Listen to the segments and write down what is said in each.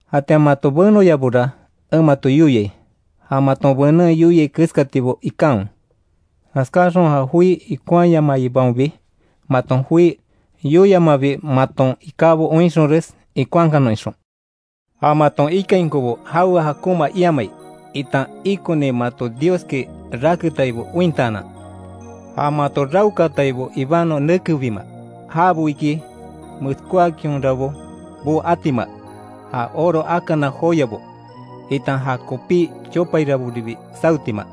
Jatian mato benoyabora en mato yoiai, ja maton benen yoiai keskatibo ikanwe. Jaskáxon ja joi ikonhayamaibaonbi, maton joi yoiamabi maton ikábo oinxonres, ikonhakanon ixon. Ja maton ikainkobo jawe jakonma iamai, itan ikoni mato Dioski raketaibo ointaanan. Ja mato raokaataibo ibanon nekebima jabo iki; meskóakinhorabo boo atima, ja oro akana joyabo, itan ja kopí chopairaboribi sawetima.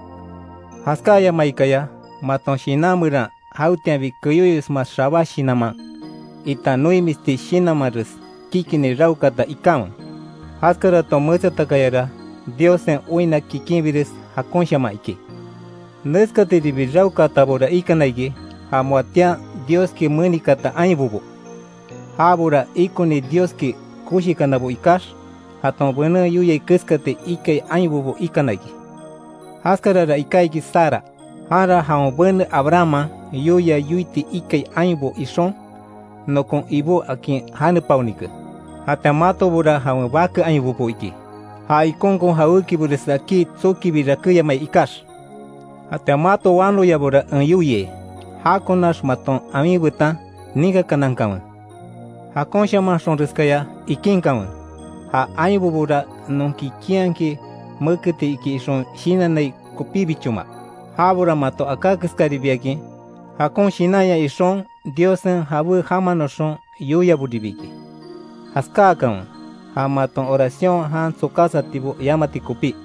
Jaskáyamaikaya maton shinan meran, jawetianbi keyóyosma xabá shinanman, itan noimisti shinanmanres, kikini raokaata ikanwe. Jaskaraton metsatakayara Diossen oinna kikinbires jakonshaman iki. Neskatiribi raokaatabora ikana iki, ja moatian Dioski menikaata ainbobo; jabora ikoni Dioski koshikanabo ikax, jaton benen yoiai keskati ikai ainbobo ikana iki. Jaskarara iká iki Sara, janra jawen bene Abrahamman yoia yoiti ikai ainbo ixon, nokon ibó akin janepaonike. Jatian matobora jawen bake ainbobo iki; ja ikonkon jawékibores akí tsokibi rakéyamai ikax. Jatian mato wanoyabora en yoiai, jakonax maton awin betan ninkakanankanwe. Jakonshamanxonreskaya ikinkanwe, ja ainbobora non kikinhakin méketi iki ixon shinannai kopíbichoma; jabora mato aká keskaribiakin, jakon shinanya ixon Diossen jabé jamanoxon yoiaboribi iki. Jaskáakanwe ja maton oracion jan tsokásatibo yamati kopí.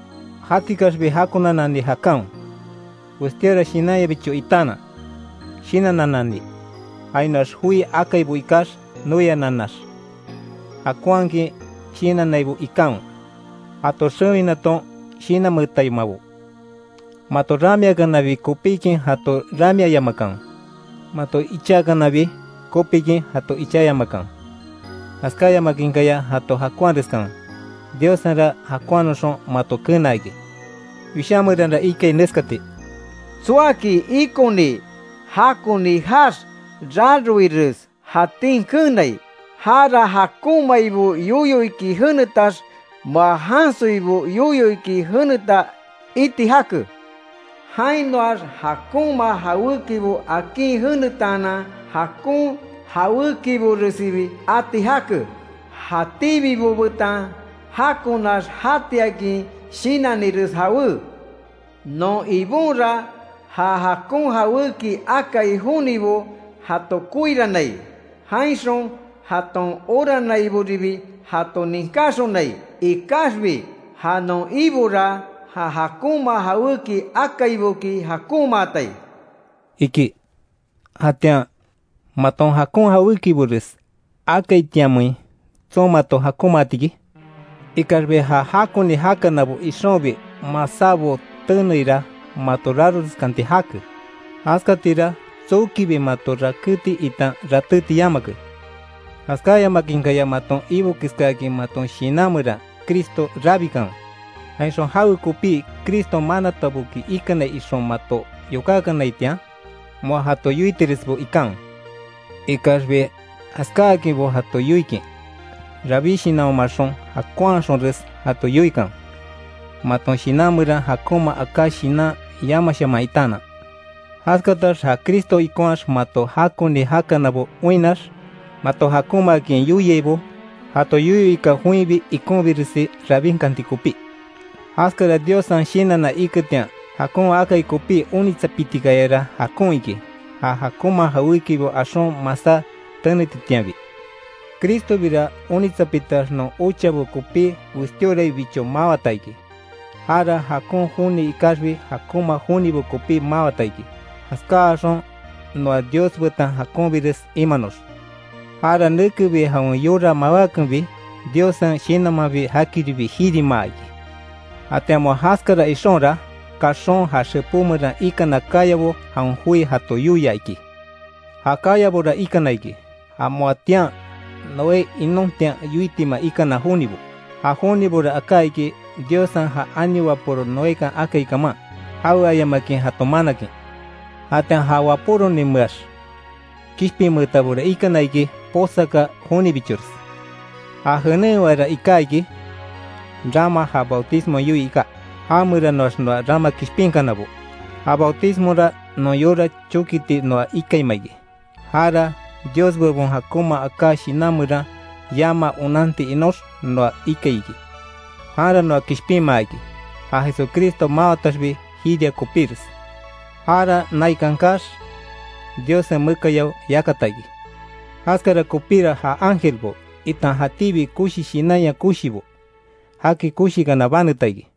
Jatikaxbi jakonanani jakanwe; westíora shinanyabicho itaanan shinannanani, jainoax joi akaibo ikax noiananax. Jakonhakin shinannaibo ikanwe, jato xewinaton shinanmeetaimabo. Mato ramiakanabi kopikin jato ramiayamakanwe, mato ichaakanabi kopikin jato ichayamakanwe jaskáyamakinkaya jato jakonhareskanwe, Diossenra jakonhanoxon mato kenaa iki. Wishá meranra ikai neskati: “Tsoaki ikoni jakoni jaax, raroires jatin keenai, jara jakonmaibo yoyo iki jenetax, moa jansoibo yoyo iki jeneta iti jake. Jainoax jakonma jawékibo akin jenetaanan jakon jawékiboresibi ati jake. Jatíbibo betan jakonax jatiakin shinannires jawé. Non Ibonra ja jakon jawéki akai jonibo jato koirannai. Jainxon jaton oranaiboribi jato ninkáxonai Ikaxbi ja non Ibora ja jakonma jawéki akaiboki, jakonmaatai”, iki. Jatian ¿Maton jakon jawékibores akaitianmein tson mato jakonmaati iki? Ikaxbi ja jakoni jakanabo ixonbi masábo teneira mato raroreskanti jake, jaskatira tsokibi mato rakéti itan ratéti yamake. Jaskáyamakinkaya maton Ibo keskáakin maton shinan meran Cristo rabikanwe, jainxon jawe kopí Criston manataboki ikanai ixon mato yokákanaitian, moa jato yoitiresbo ikanwe. Ikaxbi jaskáakinbo jato yoikin, rabí shinanhomaxon jakonhaxonres jato yoikanwe, maton shinan meran jakonma aká shinan yamashaman itaanan. Jaskatax ja Cristo ikonhaax mato jakoni jakanabo oinnax, mato jakonmaakin yoiaibo, jato yoyo ika joinbi ikonbiresi rabinkanti kopí. Jaskara Diossen shinanna iketian jakon akai kopí onitsapitikayara jakon iki, ja jakonma jawékibo axon masá tenetitianbi. Cristobira onitsapitax non ochabo kopí westíoraibicho mawata iki, jara jakon joni ikaxbi jakonma jonibo kopí mawata iki, jaskáaxon noa Dios betan jakonbires imanox. Jara nekebi jawen yora mawákenbi, Diossen Shinanmanbi jakiribi jirimaa iki. Jatian moa jaskara ixonra, kaxon ja xepó meran ikana kayabo jawen joi jato yoia iki. Ja kayabora ikana iki, ja moatian Noé inontian yoitima ikana jonibo, ja jonibora aká iki Diossen ja ani wapóro Noekan akai kaman, jaweayamakin jato manakin. Jatian ja wapóroninmeax kishpinmeetabora ikana iki posaka jonibichores. Ja jenen ewara iká iki, rama ja bautismo yoii iká. Jameranoax noa rama kishpinkanabo. Ja bautismora non yora chókiti noa ikaima iki; jara Dios bebon jakonma aká shinan meran yamaa onanti inox noa ikai iki. Janra noa kishpinmaa iki, ja Jesucristo mawataxbi jiria kopíres. Jara naikan kaax, Diossen mekayao yakata iki. Jaskara kopíra ja ángelbo itan jatíbi koshi shinanya koshibo, jaki koshikana baneta iki.